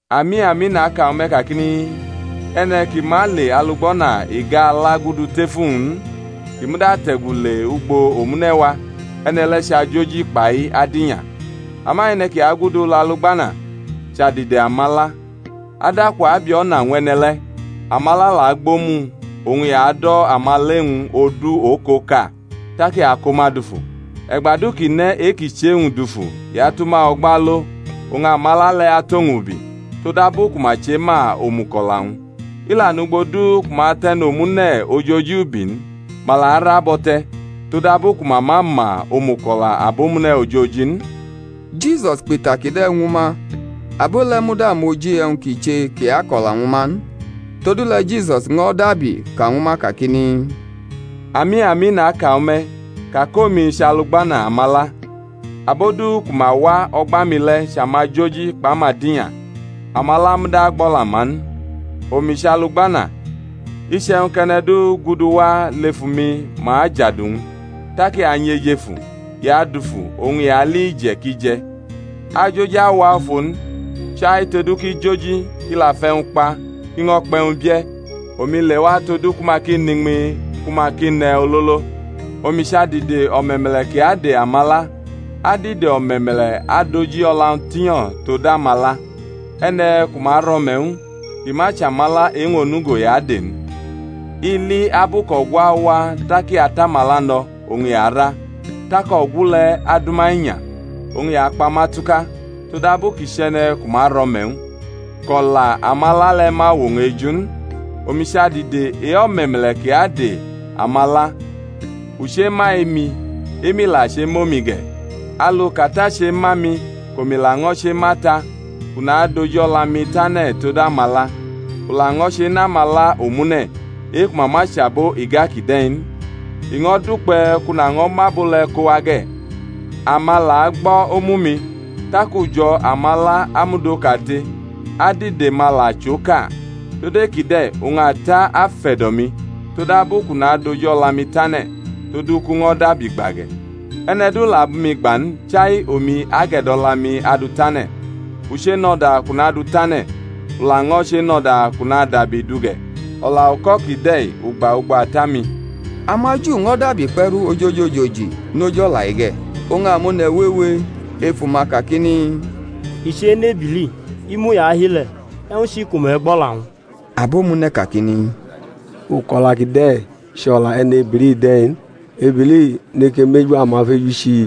Ami, ami, naka ñwu me̩ kakini, E̩ne̩ ki ma le alugbana iga-ala gudu tef uwñ n, kʼi muda ate̩gu le ugbo omune̩ wa, e̩ne̩ le̩ chʼajoji kpai adinya. Ama e̩ne̩ ki agudu lʼalugbana, chʼadide amala. Adaku abi o̩na ñw e̩ne̩ le̩, amala la agbʼomu-wñ; oñ i ado̩ amala e-wñ odu okoka, tak i ako ma dufu. E̩gba du kʼi ne̩ e-i ki chʼe-wñ dufu i atʼuma o̩gba alo, oñ amala le̩ atʼowñ ubi; todabu ku ma chema omuko̩la-wñ. I la nʼugbo du ku ma tʼe̩nomune̩ ojoji ubi n, ma la ara bʼo̩ te̩; todabu ku ma ma ma omuko̩la abomune̩ ojoji n. Jisus kpʼita kide̩ ñwu ma; abo le̩ muda mʼoji e̩wñ ki che kʼi ako̩la ñwu ma n. Todule̩ Jisus ño̩ dabi ka ñwu ma kakini, Ami, ami, naka ñwu me̩, ka kʼomi chʼalugbana amala. Abo du ku ma wa o̩gba mi le̩ chʼamajoji kpʼamadinya; amala muda gbo̩la-ma n. Omi chʼalugbana; iche̩wñ kʼe̩ne̩ du guduwa lefu mi ma ajadu-wñ; tak i anyʼejefu, i adufu, oñ i ali ije̩ kʼi je̩. Ajoji awa ofo n, chai todu kʼi joji, kʼi la fʼe̩wñ kpa, kʼi ño̩ kpʼe̩wñ bie̩; omi lewa todu ku ma ki nʼiñmi, ku ma ki nʼe̩ ololo. Omi chʼadide o̩me̩me̩le̩ ki ade amala; adide o̩me̩me̩le̩ adʼoji-o̩la-wñ tinyo̩ tod amala. E̩ne̩ ku ma rʼo̩me̩ ñw u, kʼi ma chʼamala e-wñ onugo i ade n, i li abu kʼogu awa tak i atʼamala no̩, oñ i ara, tak o̩gu le̩ adʼuma inya, oñ i akpa ma tuka; todabu kʼi chʼe̩ne̩ ku ma rʼo̩me̩ ñw u, kʼo̩la amala le̩ ma wʼowñ eju n. Omi chʼadide e-o̩me̩me̩le̩ ki ade amala; u chema e-mi, e-mi la chemʼomi ge̩, alu kʼAta chema mi, kʼomi laño̩ chema Ata; kʼu nadʼoji-o̩la-mi tane̩ tod amala. U laño̩ chenʼamala omune̩, e-ku ma ma chʼabo iga kide̩ n; i ño̩ dukpe̩ kʼu naño̩ mʼabo le kowa ge̩, ama la agbo̩ omu-mi; tak ujo̩ amala amud okate, adide-ma la chʼoka. Tod e-kide̩ oñ Ata afe̩do̩ mi, todabu kʼu nadʼoji-o̩la-mi tane̩, todu kʼu ño̩ dabi gba ge̩. E̩ne̩ du la abʼumi gba n, chai omi age̩do̩la-mi adʼu tane̩. U chenʼo̩da kʼu nadʼu tane̩, u laño̩ chenʼo̩da kʼu nadabi dʼu ge̩. O̩la uko̩ kide̩ u gba ugbo Ata-mi. AmaJu ño̩ dabi kpe̩ru ojoji ojoji noj o̩la-i ge̩. Oñ amone̩ wewe efu ma kakini, I chenʼebili, imu i ahi le̩; e̩wñ chi ku me̩ gbʼo̩la-wñ? Abo-mune̩ kakini, Uko̩la kide̩ chʼo̩la e̩ne-bili de̩ n; ebili neke mʼeju amafeju chi?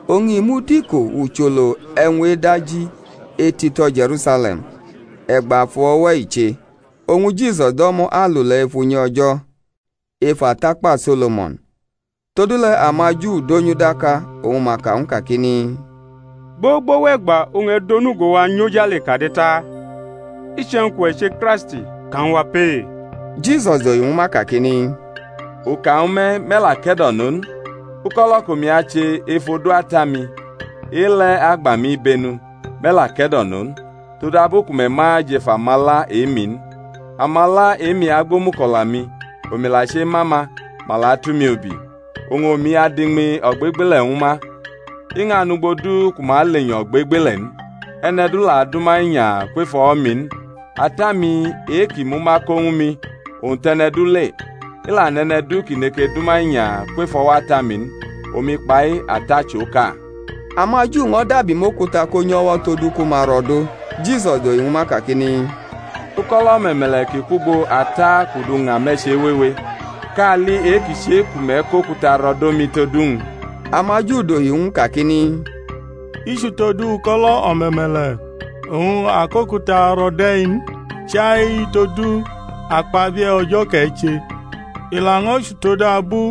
Oñ i mud iko ucholo e̩wñ edaji etito̩ Je̩rusale̩m; e̩gba afu o̩we̩ i che. Oñ Jisus do̩mo̩ alule̩ ef unyi O̩jo̩ ef atakpa So̩lo̩mo̩n. Todule̩ amaJu donyʼu daka, oñ ma ka ñw u kakini, Gbogbo wʼe̩gba oñ e̩ dʼonugo-wa nyʼojale kade ta? Iche̩wñ kʼuwe̩ che Kraist, ka ñwu wa pee. Jisus dohi ñwu ma kakini, U ka ñwu me̩, me̩ la ke̩do̩no n; uko̩lo̩ kʼomi ache ef odu Ata-mi, e-le̩ agba mi ibenu. Me̩ la ke̩do̩no n, todabu ku me̩ ma jʼef amala e-mi n. Amala e-mi agbʼomuko̩la-mi; omi la chema ma, ma la atʼumi ubi; oñ omi adʼiñmi ogbegbele̩ ñwu ma, i ñʼanʼugbo du ku ma alenyo̩ ogbegbele̩ n, e̩ne̩ du la adʼuma inya kwef o̩wo̩-mi n. Ata-mi e-kʼi mʼuma ko ñwu mi, owñ tʼe̩ne̩ du le; i la nʼe̩ne̩ du ki neke dʼuma inya kwef o̩wo̩ Ata-mi n. Omi kpai Ata chʼoka. AmaJu ño̩ dabi mʼokuta konyʼo̩wo̩ todu ku ma ro̩dʼo. Jisus dohi ñwu ma kakini, Uko̩lo̩ o̩me̩me̩le̩ ki kwʼugbo Ata kʼu du ña me̩ chewewe, kali e-ki che ku me̩ kʼokuta ro̩ do mi tod uwñ? AmaJu dohi ñw u kakini, I chʼutodu uko̩lo̩ o̩me̩me̩le̩ oñ a kʼokuta ro̩ dʼe̩-i n, chai todu akpabie̩ O̩jo̩ kʼe̩ che; i laño̩ chʼutodabu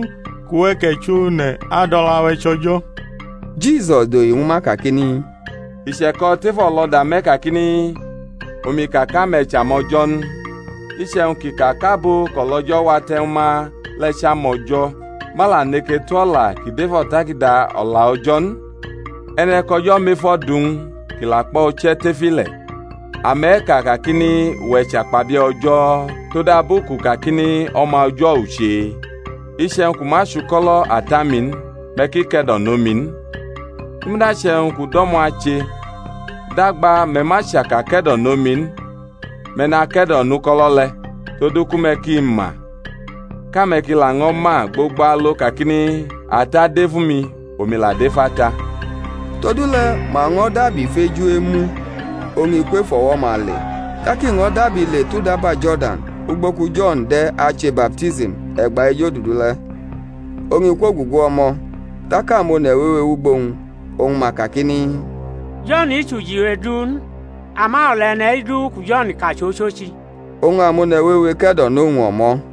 kʼuwe̩ kʼe̩chʼone̩ adʼo̩la-we̩ chʼO̩jo̩. Jisus dohi ñwu ma kakini, I che̩ko̩ tʼef o̩lo̩da-me̩ kakini, Omi ka kʼame̩ chʼamo̩jo̩ n? Iche̩wñ kʼi ka kʼabo kʼo̩lO̩jo̩ wate̩ ñwu ma le̩ chʼamo̩jo̩ ma la neke tu o̩la ki dʼef O̩takada O̩la O̩jo̩ n, e̩ne̩ kʼO̩jo̩ mʼefo̩ du ñw u kʼi la kpʼo̩ uche̩ tef ile̩, ame̩ ka kakini, Uwe̩ chakpabie̩ O̩jo̩, todabu kʼu kakini, O̩ma O̩jo̩ u che? Iche̩wñ kʼu ma chʼuko̩lo̩ Ata-mi n, me̩ ki ke̩do̩nʼomi n; i muda che̩wñ kʼu do̩mo̩ ache, dagba me̩ ma chaka ke̩do̩nʼomi n, me̩ nake̩do̩nʼuko̩lo̩ le̩, todu ku me̩ ki ma, kʼame̩ ki laño̩ ma gbogbo alo kakini, Ata dʼef umi, omi la dʼef Ata. Todule̩ ma ño̩ dabi feju emʼu; oñ i kwʼef o̩wo̩-ma le. Tak i ño̩ dabi le tʼudaba Jo̩rdan ugbo ku Jo̩n de̩ ache baptism e̩gba ejodudu le̩, oñ i kwogugu o̩mo̩. Tak amone̩ wewe wʼugbo-wñ; oñ ma kakini, Jo̩n chʼujiwe du n, ama o̩la e̩ne̩-i du ku Jo̩n ka chʼochochi. Oñ amone̩ wewe ke̩do̩nʼowñ o̩mo̩.